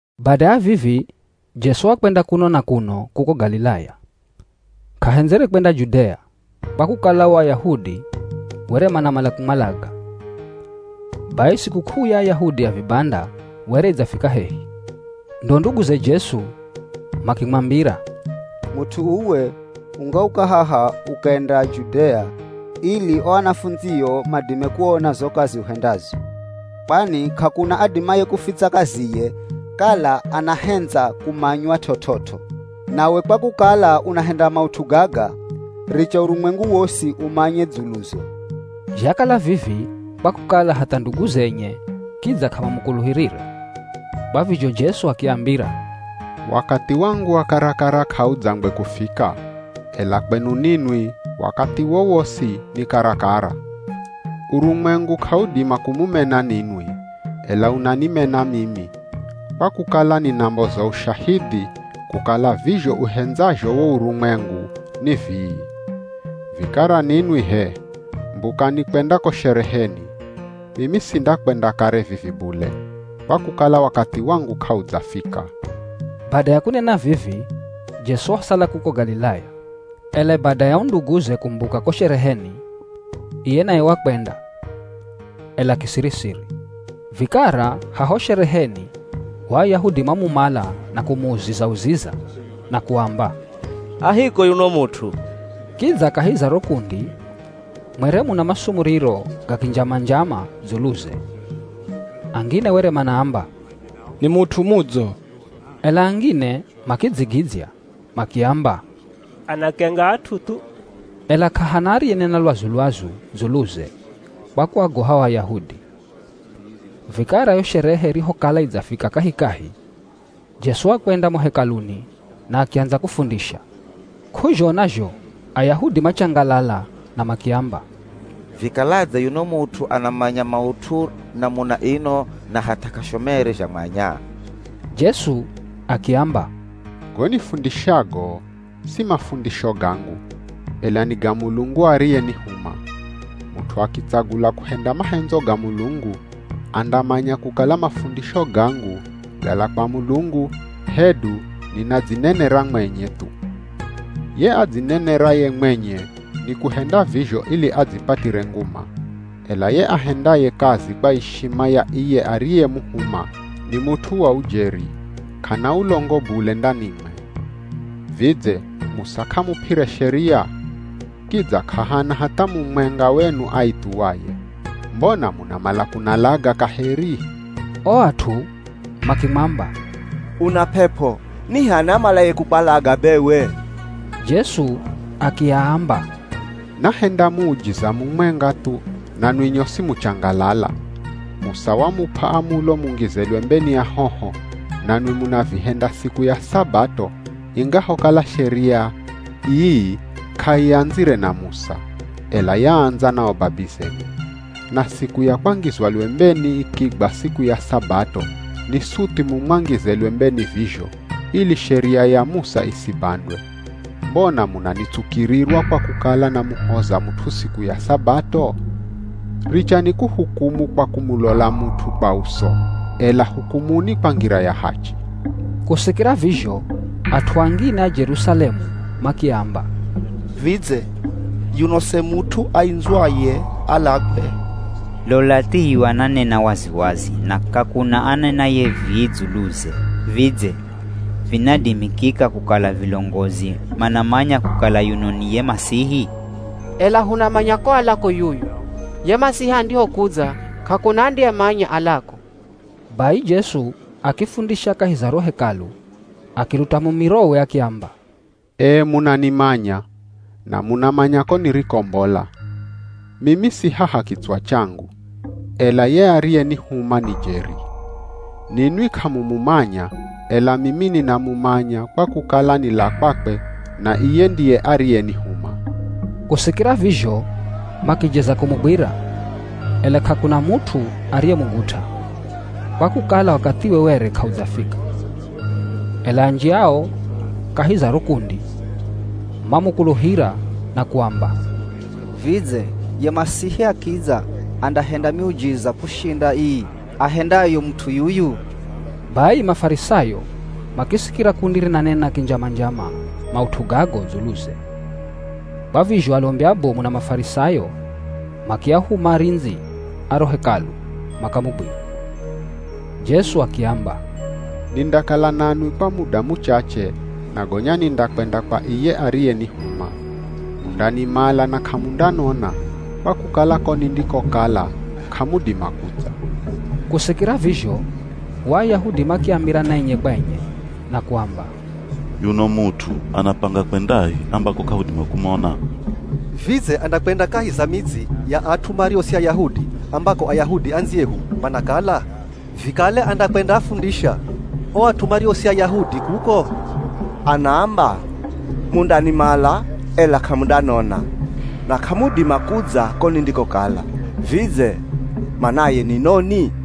Bada ya vivi Jesu wakwenda kuno na kuno kuko Galilaya, k'ahendzere kwenda Judea, kwa kukala o Ayahudi were manamala kumwalaga. Bai sikuk'uu ya Ayahudi ya Vibanda were idzafika hehi, ndo nduguze Jesu makimwambira, “Mut'u uwe ungauka haha ukenda Judea ili o anafundzio madime kuona zo kazi uhendazo. Kwani k'akuna adimaye kufitsa kaziye kala anahendza kumanywa t'ot'ot'o. Nawe kwa kukala unahenda maut'u gaga, richa urumwengu wosi umanye dzuluzo.” Zhakala vivi kwa kukala hatha nduguze enye kidza k'amamukuluhirire. Kwa vizho Jesu akiambira, “Wakathi wangu wa karakara, k'audzangwe kufika, ela kwenu ninwi wakathi wowosi ni karakara. Urumwengu k'audima kumumena ninwi, ela unanimena mimi, kwa kukala ninamboza ushahidhi kukala vizho uhendazho wo urumwengu ni vii. Vikara ninwi h'e mbukani kwenda ko shereheni. Mimi sindakwenda kare vivi bule, kwa kukala wakathi wangu k'audzafika.” Bada ya kunena vivi Jesu wasala kuko Galilaya. Ela bada ya o nduguze kumbuka ko shereheni, iye naye wakwenda, ela kisiri-siri. Vikara haho shereheni o Ayahudi mamumala na kumuuziza-uziza na kuamba, “A hiko yuno mut'u?” Kidza kahi za ro kundi mwere muna masumuriro ga kinjama-njama dzuluze. Angine were manaamba, “Ni mut'u mudzo.” Ela angine makidzigidzya makiamba, “Anakenga at'u thu.” Ela k'ahana ariyenena lwazu-lwazu dzuluze kwa kuagoha o Ayahudi. Vikara yo sherehe irihokala idzafika kahikahi, Jesu wakwenda mo Hekaluni na akiandza kufundisha. K'uzhona zho Ayahudi machangalala na makiamba, “Vikaladze yuno mut'u anamanya maut'u namuna ino na hatha k'ashomerere zhamwanya?” Jesu akiamba, “Go nifundishago, si mafundisho gangu, ela ni ga Mulungu ariyenihuma. Mut'u akitsagula kuhenda mahendzo ga Mulungu, andamanya kukala mafundisho gangu gala kwa Mulungu hedu ninadzinenera mwenye thu. Ye adzineneraye mwenye ni kuhenda vizho ili adzipatire nguma, ela ye ahendaye kazi kwa ishima ya iye ariyemuhuma ni mut'u wa ujeri, k'ana ulongo bule ndanimwe. Vidze Musa k'amup'ire sheria? Kidza k'ahana hatha mumwenga wenu aithuwaye. Mbona munamala kunalaga kaheri?” O at'u makimwamba, “Una p'ep'o! Ni h'ani amalaye kukwalaga bewe?” Jesu akiaamba, “Nahenda muujiza mumwenga thu nanwi nyosi muchangalala. Musa wamup'a amulo mungize lwembeni ahoho, nanwi munavihenda siku ya Sabato ingahokala sheria ii k'aiandzire na Musa, ela yaandza na o babizenu. Na siku ya kwangizwa lwembeni ikigwa siku ya Sabato ni suthi mumwangize lwembeni vizho, ili Sheria ya Musa isibandwe. Mbona munanitsukirirwa kwa kukala namuhoza mut'u siku ya Sabato? Richani kuhukumu kwa kumulola mut'u kwa uso, ela hukumuni kwa ngira ya hachi.” Kusikira vizho at'u angine a Jerusalemu makiamba, “Vidze yuno se mut'u aindzwaye alagwe? Lola thiyu ananena wazi-wazi na k'akuna anenaye vii dzuluze. Vidze vinadimikika kukala vilongozi manamanya kukala yuno ni ye Masihi? Ela hunamanya ko alako yuyu. Ye Masihi andihokudza k'akuna andiyemanya alako.” Bai Jesu akifundisha kahi za ro Hekalu, akiluta mumirowe akiamba, “Ee munanimanya, na munamanya ko nirikombola. Mimi si haha kitswa changu, ela ye ariyenihuma ni jeri. Ninwi k'amumumanya, ela mimi ninamumanya kwa kukala nila kwakwe na iye ndiye ariyenihuma.” Kusikira vizho, makijeza kumugwira, ela k'akuna mut'u ariyemugut'a, kwa kukala wakathiwe were k'audzafika. Ela anji ao kahi za ro kundi mamukuluhira na kuamba, “Vidze ye Masihi akidza andahenda miujiza kushinda ii ahendayo mut'u yuyu?” Bai Mafarisayo makisikira kundi rinanena kinjama-njama maut'u gago dzuluze. Kwa vizho alombi abomu na Mafarisayo makiahuma arindzi a ro Hekalu makamugwire. Jesu akiamba, “Nindakala nanwi kwa muda muchache na gonya nindakwenda kwa iye ariyenihuma. Mundanimala na k'amundanona, kwa kukala ko nindikokala k'amudima kudza.” Kusikira vizho o Ayahudi makiambirana enye kwa enye na kuamba, “Yuno mut'u anapanga kwendahi ambako k'ahudima kumona? Vidze andakwenda kahi za midzi ya at'u mario si Ayahudi ambako Ayahudi andziyehu manakala? Vikale andakwendaafundisha o at'u mario si Ayahudi kuko? Anaamba, ‘Mundanimala, ela k'amundanona,’ na ‘k'amudima kudza ko nindikokala.’ Vidze manaye ni noni?”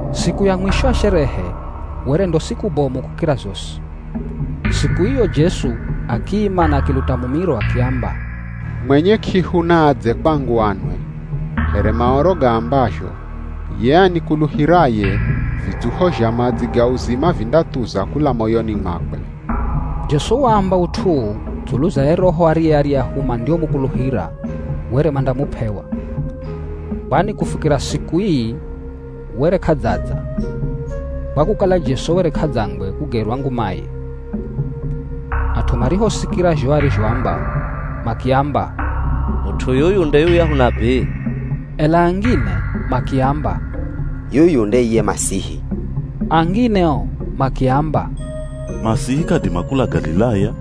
Siku ya mwisho ya sherehe were ndo siku bomu kukira zosi. Siku iyo Jesu akiima na akiluta mumiro akiamba, “Mwenye k'ihu naadze kwangu anwe. Here Maoro gaambazho, ‘Ye anikuluhiraye vidzuho zha madzi ga uzima vindathuza kula moyoni mwakwe.’” Jesu waamba ut'u uu dzulu za ye Roho ariye aryahu mandiomukuluhira were mandamup'ewa. Kwani Kufikira siku ii were k'adzadza, kwa kukala Jesu were k'adzangwe kugerwa ngumaye. At'u marihosikira zho arizhoamba. Makiamba, “Mut'u yuyu nde yuyahu nabii.” Ela angine makiamba, “Yuyu nde iye Masihi.” Angine o makiamba, “Masihi k'adima kula Galilaya.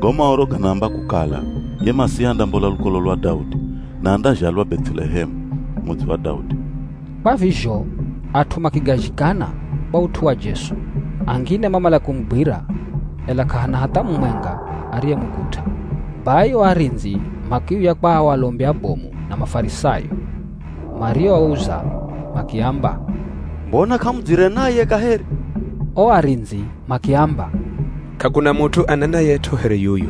Go Maoro ganaamba kukala ye Masihi andambola lukolo lwa Daudi na andazhalwa Beth'elehemu, mudzi wa Daudi.” Kwa vizho at'u makigazhikana kwa ut'u wa Jesu. Angine mamala kumugwira, ela k'ahana hatha mumwenga ariyemugut'a. Bai o arindzi makiuya kwa o alombi abomu na Mafarisayo marioauza makiamba, “Mbona k'amudzire naye kaheri?” O arindzi makiamba, “K'akuna mut'u anenayet'o here yuyu.”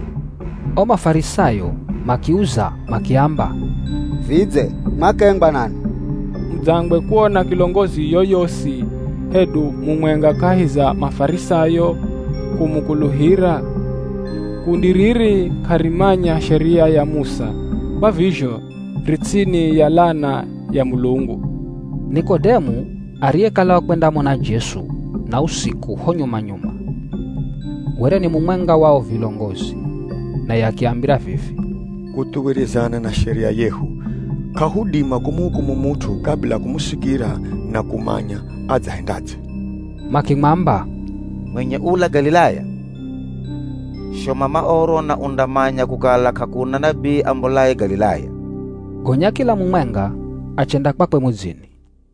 O Mafarisayo makiuza makiamba, “Vidze mwakengwa nanwi? Mudzangwe kuona kilongozi yoyosi hedu mumwenga kahi za Mafarisayo kumukuluhira? Kundi riri k'arimanya Sheria ya Musa, kwa vizho ri ts'ini ya lana ya Mulungu!” Nikodemu ariyekala wakwendamona Jesu na usiku ho nyuma-nyuma, were ni mumwenga wa o vilongozi, naye akiambira vivi, “Kuthuwirizana na Sheria yehu, k'ahudima kumuhukumu mut'u kabila kumusikira na kumanya adzahendadze.” Makimwamba, “Mwenye ula Galilaya? Shoma Maoro na undamanya kukala k'akuna nabii ambolaye Galilaya.” [ Gonya kila mumwenga achenda kwakwe mudzini.